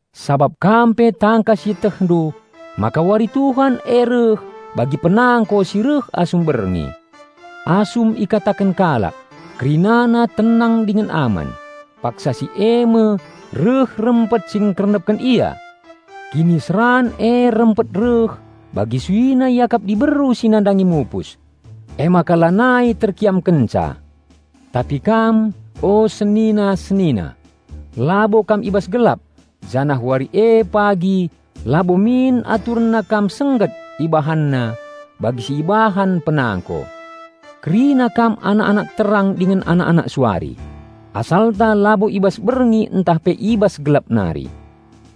Sabap kam pe tangkas ietehndu maka Wari Tuhan e reh bagi penangko si reh asum berngi. Asum ikataken kalak, "Kerinana tenang dingen aman," paksa si e me reh rempet si ngkernepken ia! Kiniseran e rempet reh bagi suina iakap diberu si nandangi mupus. Emaka lanai terkiamkenca. Tapi kam, o senina-senina, labo kam i bas gelap, janah wari e pagi labo min aturenna kam sengget ibahanna bagi si ibahan penangko. Kerina kam anak-anak terang dingen anak-anak suari. Asalta labo i bas berngi ntah pe i bas gelap nari.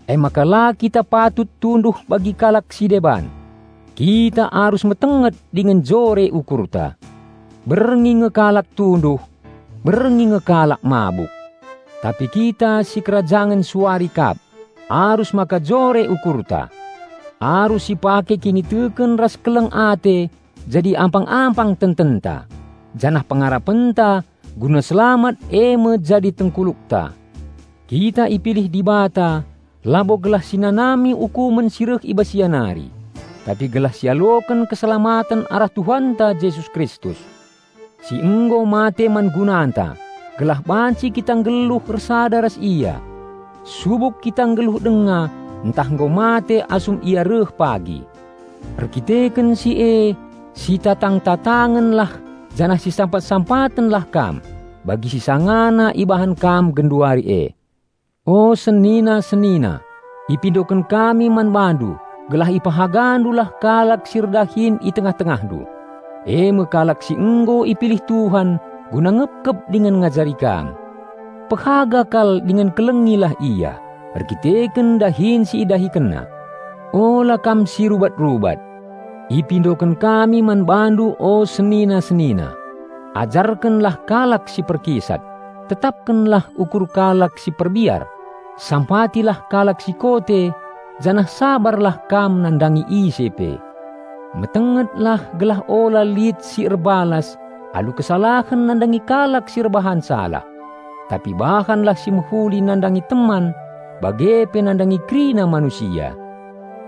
Emaka la kita patut tunduh bagi kalak si deban. Kita arus metenget dingen jore ukurta. Berngi nge kalak tunduh; berngi nge kalak mabuk. Tapi kita sikerajangen suari kap; arus maka jore ukurta. Arus sipake kiniteken ras keleng ate jadi ampang-ampang tententa, janah pengarapenta guna selamat e me jadi tengkulukta. Kita ipilih Dibata labo gelah si nanami ukumen si reh i bas Ia nari, tapi gelah sialoken keselamaten arah Tuhanta Jesus Kristus, si nggo mate man gunanta gelah banci kita nggeluh ersada ras Ia, subuk kita nggeluh denga ntah nggo mate asum Ia reh pagi. Erkiteken si e sitatang-tatangenlah janah sisampat-sampatenlah kam bagi si sangana ibahan kam genduari e. O senina-senina, ipindoken kami man bandu gelah ipehagandulah kalak si erdahin i tengah-tengahndu, e me kalak si nggo ipilih Tuhan guna ngepkep dingen ngajari kam. Pehaga kal dingen kelengilah ia, erdandanken dahin si idahikenna. Ula kam si rubat-rubat. Ipindoken kami man bandu o senina-senina: Ajarkenlah kalak si perkisat, tetapkenlah ukur kalak si perbiar, sampatilah kalak si kote janah sabarlah kam nandangi ise pe. Metengetlah gelah ula lit si erbalas alu kesalahen nandangi kalak si erbahan salah, tapi bahanlah si mehuli nandangi teman bage pe nandangi kerina manusia.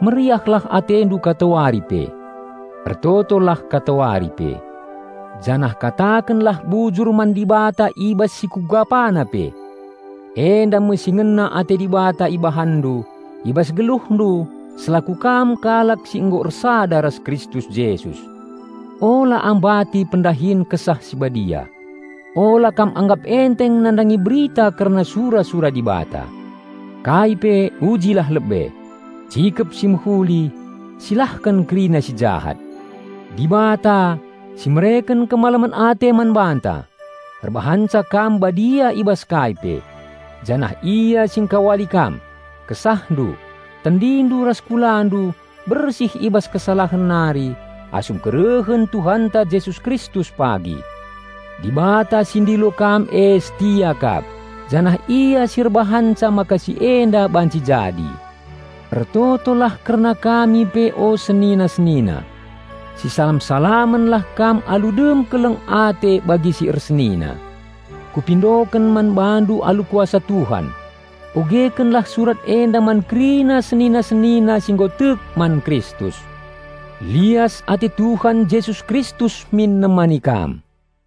Meriahlah atendu katawari pe. Ertotolah katawari pe, janah katakenlah bujur man Dibata i bas si kugapana pe. Enda me si ngena ate Dibata ibahanndu i bas geluhndu selaku kam kalak si nggo ersada ras Kristus Jesus. Ula ambati pendahin Kesah Si Badia. Ula kam anggap enteng nandangi berita kerna sura-sura Dibata. Kai pe ujilah lebe; cikep si mehuli, silahken kerina si jahat. Dibata, si mereken kemalemen ate man banta, erbahanca kam badia i bas kai pe; janah Ia si engkawali kam, kesahndu, tendindu ras kulandu bersih i bas kesalahen nari asum kerehen Tuhanta Jesus Kristus pagi. Dibata si ndilo kam e setia kap, janah Ia si erbahanca maka si enda banci jadi. Ertotolah kerna kami pe o senina-senina. Sisalam-salamenlah kam alu dem keleng ate bagi si ersenina. Kupindoken man bandu alu kuasa Tuhan: Ogekenlah surat enda man kerina senina-senina si nggo tek man Kristus. Lias ate Tuhan Jesus Kristus min nemani kam.